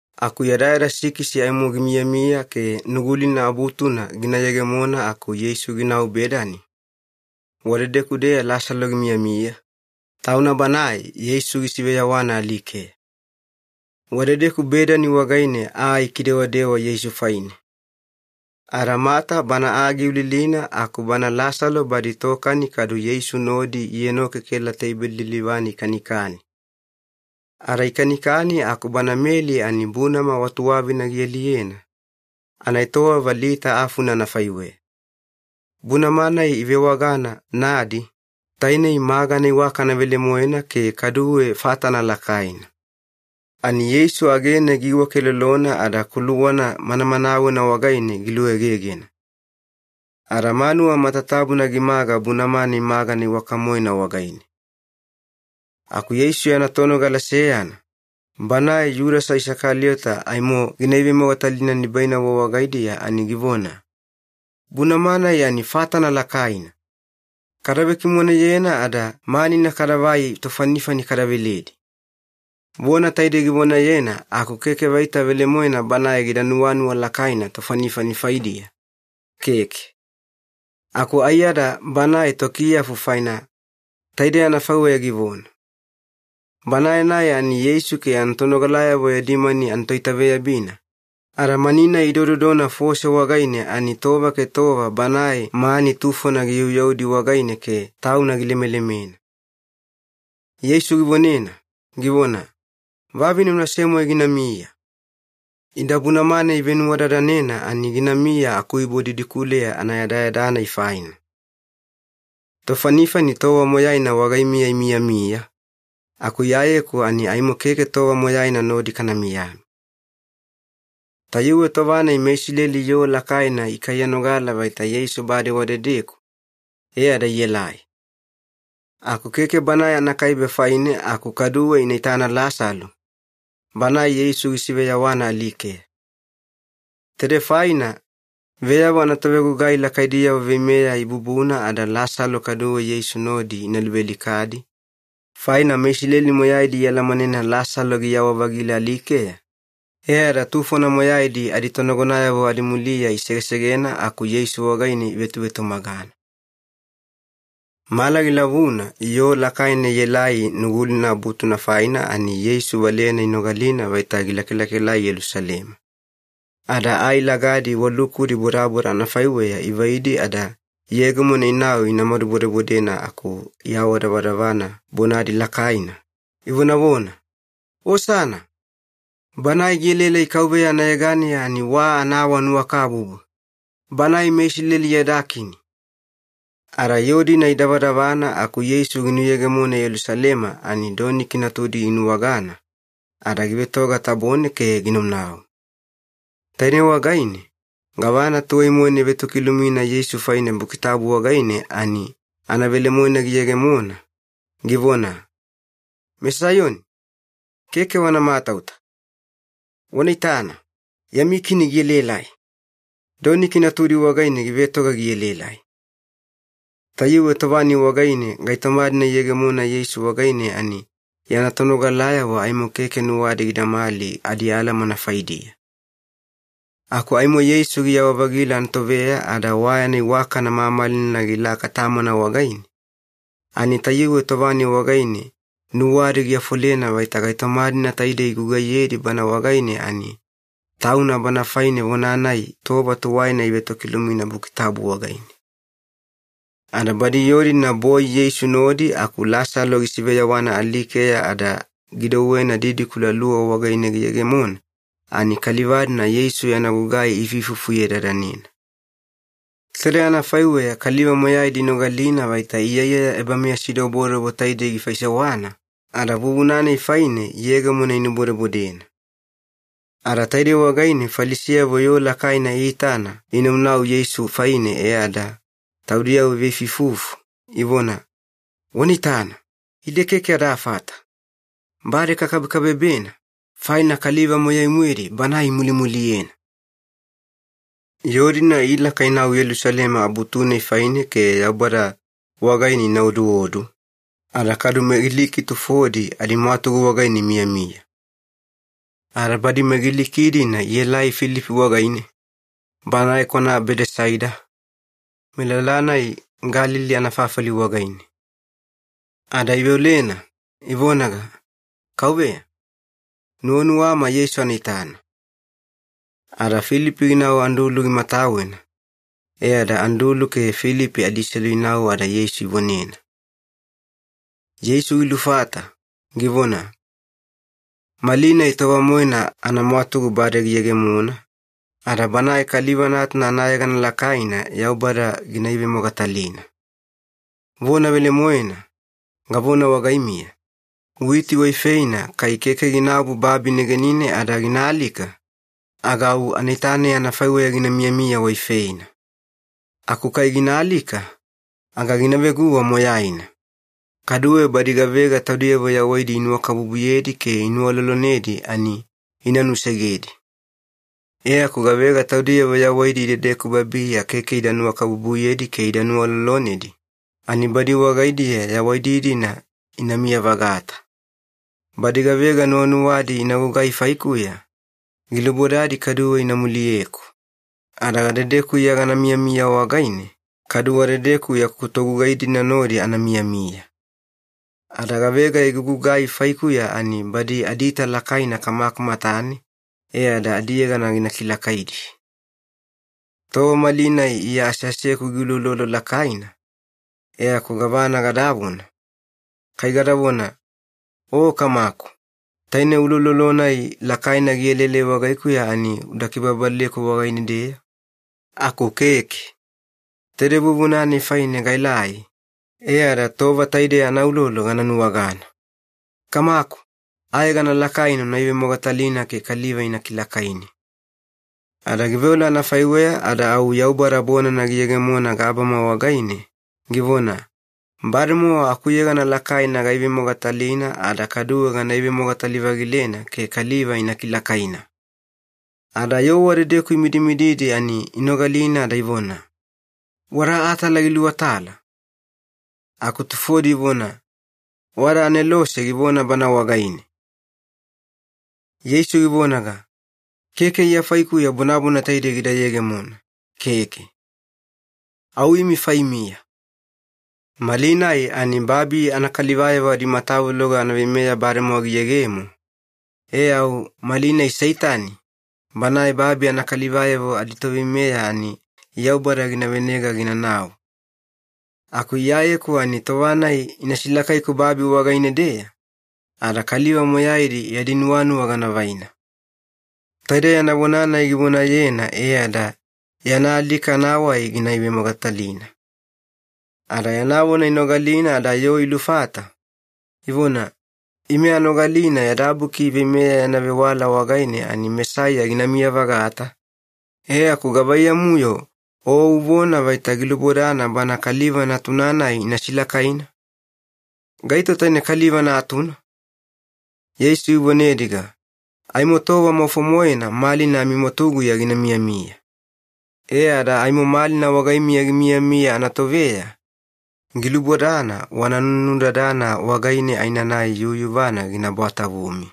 Aku yadayada sikisi aimo gimiyamiya ke Nugulina Abutuna gina yegemona aku Yeisu ginau Bedani, wadedeku-deya Lasalo gimiyamiya, tauna banae Yeisu gisiveyawana alikeya. Wadedeku Bedani wagaine aa ikidewadewa Yeisu faine. Ada Mata bana aa giulilina aku bana Lasalo badi tokani kadu Yeisu nodi ienokekela teibeli lilivane ikanikani. Ada ikanikani aku bana Meli ani bunama wa tuwavina gialiyena, anaetowava lita afuna anafaiweya. Bunama-nai ivewagana ‘nadi’, tainei magana iwakana velemoena ke kaduwe fatana lakaina. Ani Yeisu agene giiwakelolona ada kuluwana manamanawena wagaine giluegegena. Ada manuwa matatabuna gimaga bunama-nai magana iwaka-moena wagaine. Aku Yeisu yana tonogala seyana, banae Yudasa Isakaliyota aimo gina ivemogatalina nibainavo wagaidiya ani givona, “Bunama-nai ani fatana lakaina! Kada vekimoneyena ada manina kadavai tofanifani kada veledi.” Vona taidei givonayena aku keke vaita velemoena banae gida nuwanuwa lakaina tofanifani faidiya, keke. Aku aiyada banae tokiyafu faina taidei anafaiweya givona. Banae-nai ani Yeisu ke tonogalayavo yadi mani anatoitaveyabina, ada mani-nai idododona fose wagaine ani tova ke tova banae mani tufona giyauyaudi wagaine ke tauna gilemelemena. Yeisu givonena, givona, “Vavine unase-moe ginamiya. Ida bunama-nai ivenuwadadanena ani ginamiya akuibo didikuleya anayadayada-nai faina. Tofanifani tova moyaina wagaimiya imiyamiya, aku Iyayeku ani aimo keke tova moyaina nodi kana miyamiya.” Tayuwe tova-nai meIsileli yoo lakaina ikaiyanogala vaita Yeisu bade wadedeku, e ada ielai. Aku keke Banae anakaibe faine aku kaduwe ina itana Lasalo, banae Yeisu gisiveyawana alikeya. Taidei faina veyavo anatovegugai lakaidiyavo veimeya ibubuna ada Lasalo kaduwe Yeisu nodi ina luvealikadi, faina meIsileli moyaidi ialamanena Lasalo giyawa-vagila alikeya, e ada tufona moyaidi aditonagonayavo adimuliya isegesegena aku Yeisu wagaine ivetuvetumagana. Mala gilavuna yoo lakaina ielai Nugulina Abutuna faina ani Yeisu valeyana inogalina vaita gilakalakaelai Yelusalema. Ada ai lagadi wa lukudi bodaboda anafaiweya ivaidi ada iyegemona inau inamadu bodebodena aku iawadavadavana bonadi lakaina, ivonavona, “Osana! Banae gielaelai KAUVEYA anayeganeya ani wa anaawanuwakabubu! Banae meIsileli yada Kini!” Ada yoo-dina idavadavana aku Yeisu ginuyegemona Yelusalema ani doniki natudi ginuwagana, ada givetoga tabone ke ginaunau. Tainei wagaine gavana tuwai-moena ivetokilumina Yeisu faine Buki Tabu wagaine ani anavelemoena giyegemona, givona, “MeSaiyoni, keke wana matauta. Wana itana, yami Kini gielaelai. Doniki natudi wagaine givetoga gielaelai.” Tayuwe tova-nai wagaine gaitoma-dina iyegemona Yeisu wagaine ani yana tonogalayavo aimo keke nuwadi gidamali adialamana faidiya. Aku aimo Yeisu giyawa-vagila anatoveya ada wa yana iwakana mamalina gilaka Tamana wagaine, ani tayuwe tova-nai wagaine nuwadi giafolena vaita gaitoma-dina taide igugaiyedi Bana wagaine ani Tauna Bana faine vona-nai tova tuwaina ivetokilumina Buki Tabu wagaine. Ada badi yoo-dina boi Yeisu nodi aku Lasalo gisiveyawana alikeya ada gidouwena didikula luwa wagaine giyegemona, ani kaliva-dina Yeisu yana gugai ifuifufuyedadanena. Taide anafaiweya kaliva moyaidi inogalina vaita iyaiyaya ebameyasidobodobo taidei gifaisewana, ada vuvuna-nai faine iyegemona inubodebodena. Ada taidei wagaine Falisiyavo yoo lakaina iitana inaunau Yeisu faine e ada taudiyavo iveifuifufu, ivona, “Wana itana, ide keke adafata! Bade kakabekabebena, faina kaliva moyai-moedi Banae imulimuliyena!” Yoo-dina ilaka inau Yelusalema Abutu-nai faine ke Yaubada wagaine ina oduodu, ada kadu meGiliki tufodi adimwatugu wagaine imiyamiya. Ada badi meGiliki-dina ielai Filipi wagaine, banae kwana Bedesaida, melala-nai Galili anafafali wagaine. Ada iveolena, ivonaga, “Kauveya, nuwanuwama Yeisu ana itana.” Ada Filipi ginau Andulu gimatawena, e ada Andulu ke Filipi adiselu inau ada Yeisu ivonena. Yeisu gilufata, givona, “Malinai tova-moena anamwatugu bade giyegemona ada Banae Kaliva Natuna anayegana lakaina Yaubada gina ivemogatalina. Vona velemoena, gavona wagaimiya, witi waifeina kai keke ginaobu babi negenine ada gina alika aga au anaita-nai anafaiweya gina miyamiya waifeina. Aku kai gina alika, aga gina veguwa moyaina. Kaduwe badi gavega taudiyavo yawaidi inuwakabubuyedi ke inuwalolonedi ani ina nusegedi. E aku gavega taudiyavo yawaidi idedeku babiya keke ida nuwakabubuyedi ke ida nuwalolonedi, ani badi wagaidiya yawaidi-dina inamiya-vagata. Badi gavega nuwanuwadi ina gugai faikuya, gilubodadi kaduwe ina muliyeku, ada gadedeku Iya gana miyamiya wagaine, kadu wadedeku yaku togugai-dina nodi ana miyamiya. Ada gavega igugugai faikuya ani badi adiita lakaina Kamaku matane e ada adiyegana gina kilakaidi. “Tova malinai Iya aseaseku giuloulolo lakaina, e aku gavana gadavona? Kai gadavona, ‘O Kamaku, taine uloulolo-nai lakaina gielaelai wagaikuya ani uda kibababaleku wagaine-deya?’ Aku keke. Taide vuvuna-nai faine gaelai, e ada tova taidei anaulolo gana nuwagana. Kamaku, ayegana lakaina una ivemogatalina ke kaliva ina kilakaini!” Ada giveola anafaiweya ada au Yaubada bonana giyegemona gabama wagaine, givona, “Bademowa akuyegana lakaina gaivemogatalina ada kaduwe gana ivemogatali-vagilena ke kaliva ina kilakaina.” Ada yoo wadedeku imidimididi ani inogalina ada ivona, “Wada atala giluatala,” aku tufodi ivona, “Wada anelose givona Bana wagaine.” Yeisu givonaga, “Keke Iya faikuya bonana taide gida yegemona, keke. Au imi faimiya. Malinai ani babi anakalivayavo adimatavuloga anaveimeya bademowa giyegemo, e au malinai Seitani, banae babi anakalivayavo aditoveimeya ani Yaubada gina venega ginanau. Aku Iyayeku ani tova-nai ina silakaiku babi wagaine-deya, ada kaliva moyaidi yadi nuwanuwa gana vaina.” Taide yana vona-nai givonayena e ada yana alika anawai gina ivemogatalina. Ada yana vona inogalina ada yoo ilufata, ivona, “Ime anogalina yada Buki Veimeya yana vewala wagaine ani Mesaiya ginamiya-vagata, e aku gavaiyamu-yo O uvona vaita gilubodana Bana Kaliva Natuna-nai ina silakaina? Gaito taine Kaliva Natuna?” Yeisu givonediga, “Aimo tova maufo-moena malina amimwatuguya gina miyamiya. E ada aimo malina wagaimiya gimiyamiya anatoveya, gilubodana wana nunudadana wagaine aenanai yuyuvana gina bwatavumi.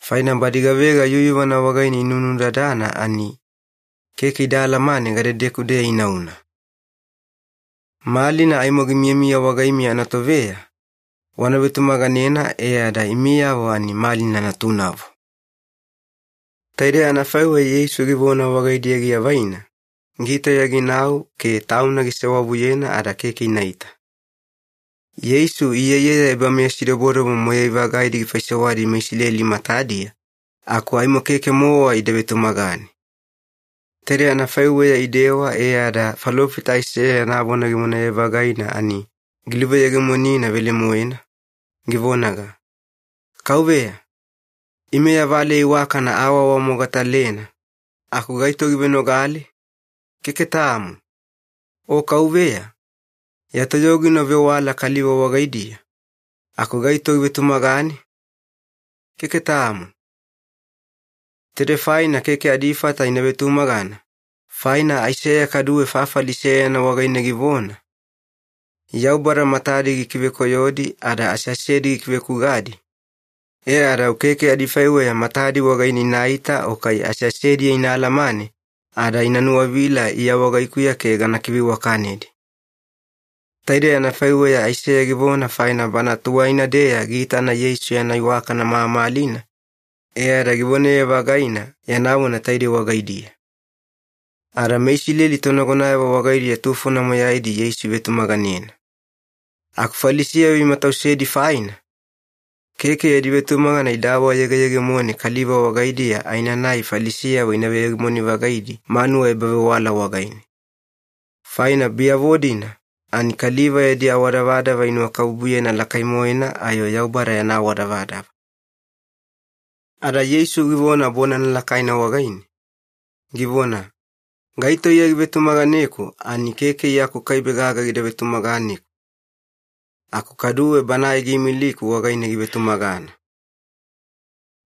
Faina badi gavega yuyuvana wagaine inunudadana ani keke ida alamane gadedeku-deya inauna. Malina aimo gimiyamiya wagaimiya anatoveya, wana vetumaganena e ada imiyavo ani malina natunavo.” Taidei anafaiweya Yeisu givona wagaidiya giavaina, gitauya ginau ke Tauna gisewavuyena ada keke inaita. Yeisu iyaiyaya ebameyasidobodobo moyai-vagaidi gifaisewadi meIsileli matadiya, aku aimo keke-mowa ida vetumagane. Taidei anafaiweya idewa e ada falofita Aiseya yana vona givonaye-vagaina ani giluveyegemonina velemoena, givonaga, “KAUVEYA, ime ya valeya iwakana aawaawamogatalena aku gaito givenogale? Keke tamo. O KAUVEYA, ya toyogina uvewala kaliva wagaidiya, aku gaito givetumagane? Keke tamo.” Taidei faina keke adifata ina vetumagana, faina Aiseya kaduwe fafali seyana wagaine givona, “Yaubada matadi gikivekoyodi ada aseasedi gikivekugadi, e ada au keke adifaiweya matadi wagaine inaita o kai aseasediya ina alamane ada ina nuwavila Iya wagaikuya ke gana kiveiwakanedi.” Taidei anafaiweya Aiseya givona faina bana tuwaina-deya giitana Yeisu yana iwakana mamalina, e ada givonaye-vagaina yana vona taide wagaidiya. Ada meIsileli tonagonayavo wagaidiya tufona moyaidi Yeisu ivetumaganena. Aku Falisiyavo imatausedi faina, keke yadi vetumagana ida awayegeyegemone kaliva wagaidiya aenanai Falisiyavo ina veyegemoni-vagaidi manuwa ebavewala wagaine. Faina biyavo-dina ani kaliva yadi awadavadava inuwakabubuyena lakai-moena ayo Yaubada yana awadavadava. Ada Yeisu givona bonana lakaina wagaine, givona, “Gaito Iya givetumaganeku ani keke Iya akukaibe gaga gida vetumaganeku, aku kaduwe Banae giimiliku wagaine givetumagana.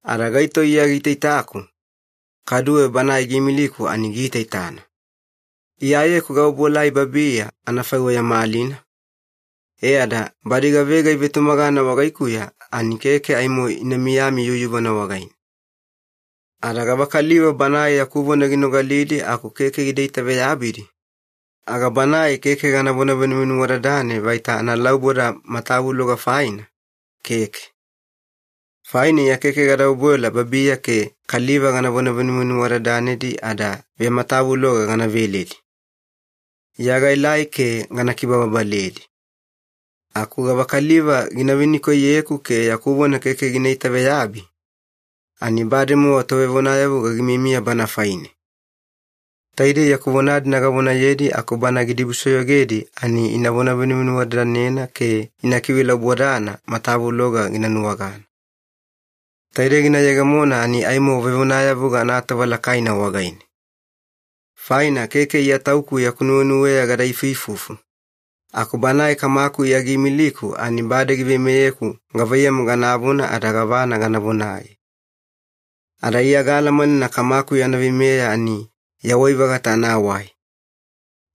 Ada gaito Iya giitaitaku, kaduwe Banae giimiliku ani giitaitana. Iyayeku gaobuelai babiya anafaiweya malina, e ada badi gavega ivetumagana wagaikuya ani keke aimo ina miyami yuyuvana wagaine. Ada gavakaliva banae yaku vona ginogalidi aku keke gida itaveyabidi, aga banae keke ganavona venuvenuwadadane vaita analauboda matavuloga faina, keke. Faina Iya keke gada obuela babiya ke kaliva ganavona venuvenuwadadanedi ada vematavuloga gana veledi. Iya gaelai ke gana kibababaledi. Aku gavakaliva gina venikoiyeku ke yaku vona keke gina itaveyabi, ani bademowa tovevonayavuga gimiyamiya bana faine. Taidei yaku vona-dina gavonayedi aku bana gidibusoyogedi ani inavona venuvenuwadadanena ke ina kivelaubodana matavuloga gina nuwagana. Taide gina yegemona ani aimo vevonayavuga anatova lakaina wagaine. Faina keke Iya Tauku yaku nuwenuweya gada ifuifufu, aku Banae Kamaku Iya giimiliku ani bade giveimeyeku gavaiyamu ganavona ada gavana gana vonaye. Ada Iya gaalamanena Kamaku yana veimeya ani yawai-vagata anawai.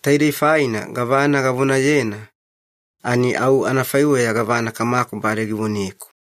Taidei faina gavana gavonayena ani au anafaiweya gavana Kamaku bade givoneku.”